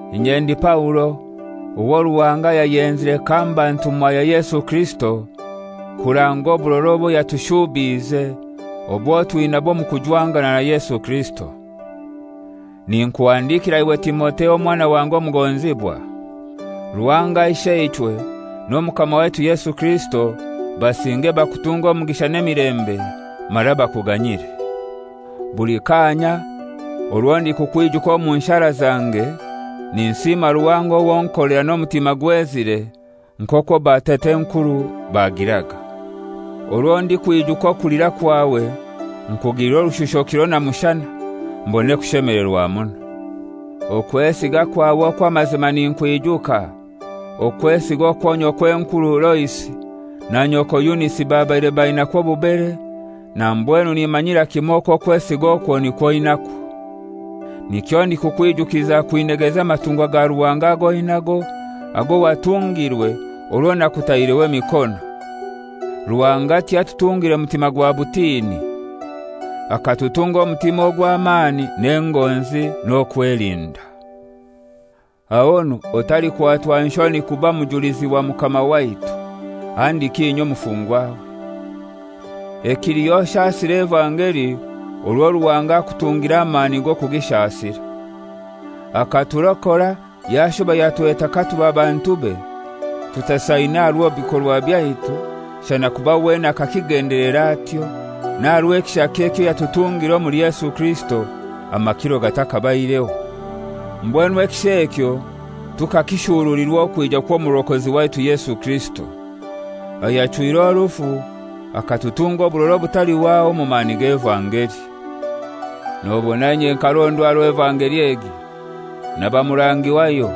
Inye ndi Paulo, owo Ruhanga yayenzire kamba ntumwa ya Yesu Kirisito kuranga oburora obwo yatushuubiize obwo twinabwo omu kujwangana na Yesu Kirisito. Ninkuhandikira iwe Timotheo, omwana wange omugonzibwa. Ruhanga Isheichwe n'Omukama waitu Yesu Kirisito basinge bakutunge omugisha n'emilembe, mara bakuganyire. Buli kaanya orwo ndikukwijuka omu nshara zange, ninsiima Ruhanga owo nkolera n'omutima gwezire, nk'okwo batat'enkuru bagiraga. Orwo ndikwijuka okulira kwawe nkugilira orushusho kiro na mushana, mbone kushemelerwa muno. Okwesiga kwawe okw'amazima ninkwijuka, okwesiga okwo nyokw'enkuru Loisi na nyoko Yunisi babaire bainakwo obubere, na mbwenu nimanyira kimoi okwo okwesiga okwo nikwo oinakwo. Nikyo ndikukwijukiza kwinegeza amatungwa ga Ruhanga ag'oinago, ago watungirwe orwo nakutaireho emikono. Ruhanga tiyatutungire mutima gwa butini. Akatutunga omutima ogw'amani n'engonzi n'okwelinda. Ahonu otalikwatwa nshoni kuba mujulizi wa Mukama waitu, handiki inye omufungwawe. Ekiliho oshasire evangeli, orwo Ruhanga akutungire amani g'okugishasira. Akaturokora yashuba yatweta katuba bantube, tutasaine aha rwabikorwa byaitu, shana kuba wenene akakigendelera atyo, n'aha rw'ekisha ekyo yatutungire omuli Yesu Kirisito amakiro gatakabaireho. Mbwenu ekisha ekyo tukakishurulirwa okwija kw'Omurokozi waitu Yesu Kirisito; ayachwire orufu, akatutunga oburora obutalihwaho omu mani g'evangeli. Nobona inye nkarondwa aha rw'evangeli egi, naba murangi wayo,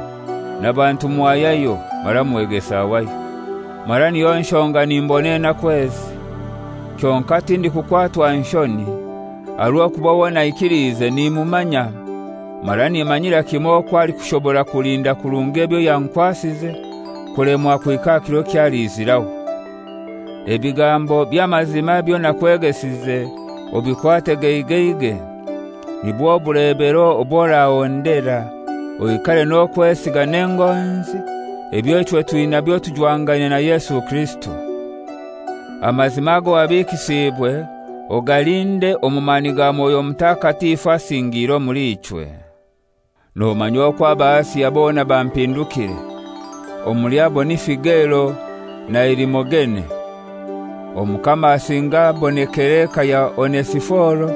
naba ntumwa yayo mara mwegesa wayo, mara niyo nshonga nimbona enaku ezi. Kyonkai tindikukwatwa nshoni, aha rw'okuba owo naikiliize nimumanya, mara nimanyira kimoi okwo alikushobora kulinda kurungi ebyo yankwasize kulemwa kuhika aha kiro eky'aliiziraho. Ebigambo by'amazima ebyo nakwegesize obikwate geigeigei, nibwo bulebero obw'orahondera, oikare n'okwesiga n'engonzi ebyo ichwe twinabyo tujwangaine na Yesu Kirisito. Amazima ago wabikisiibwe ogalinde omu mani ga Mwoyo Mutakatifu asingiire omuli ichwe. Nomanya okwo aba Asia bona bampindukire, omuli abo ni Figelo na Herimogene. Omukama asinge abonekere eka ya Onesiforo,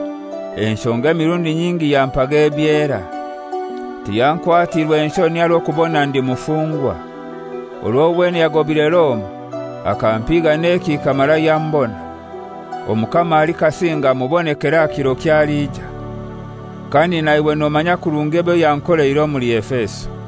enshonga emirundi nyingi yampaga ebyera; tiyankwatiirwe nshoni aha rw'okubona ndi mufungwa. Orwo wenene yagobire Roma akampiiga n'ekihika mara yambona. Omukama alikasinga amubonekere aha kiro ky'aliija. Kandi na iwe nomanya kurungi ebyo yankoleire omuli Efeso.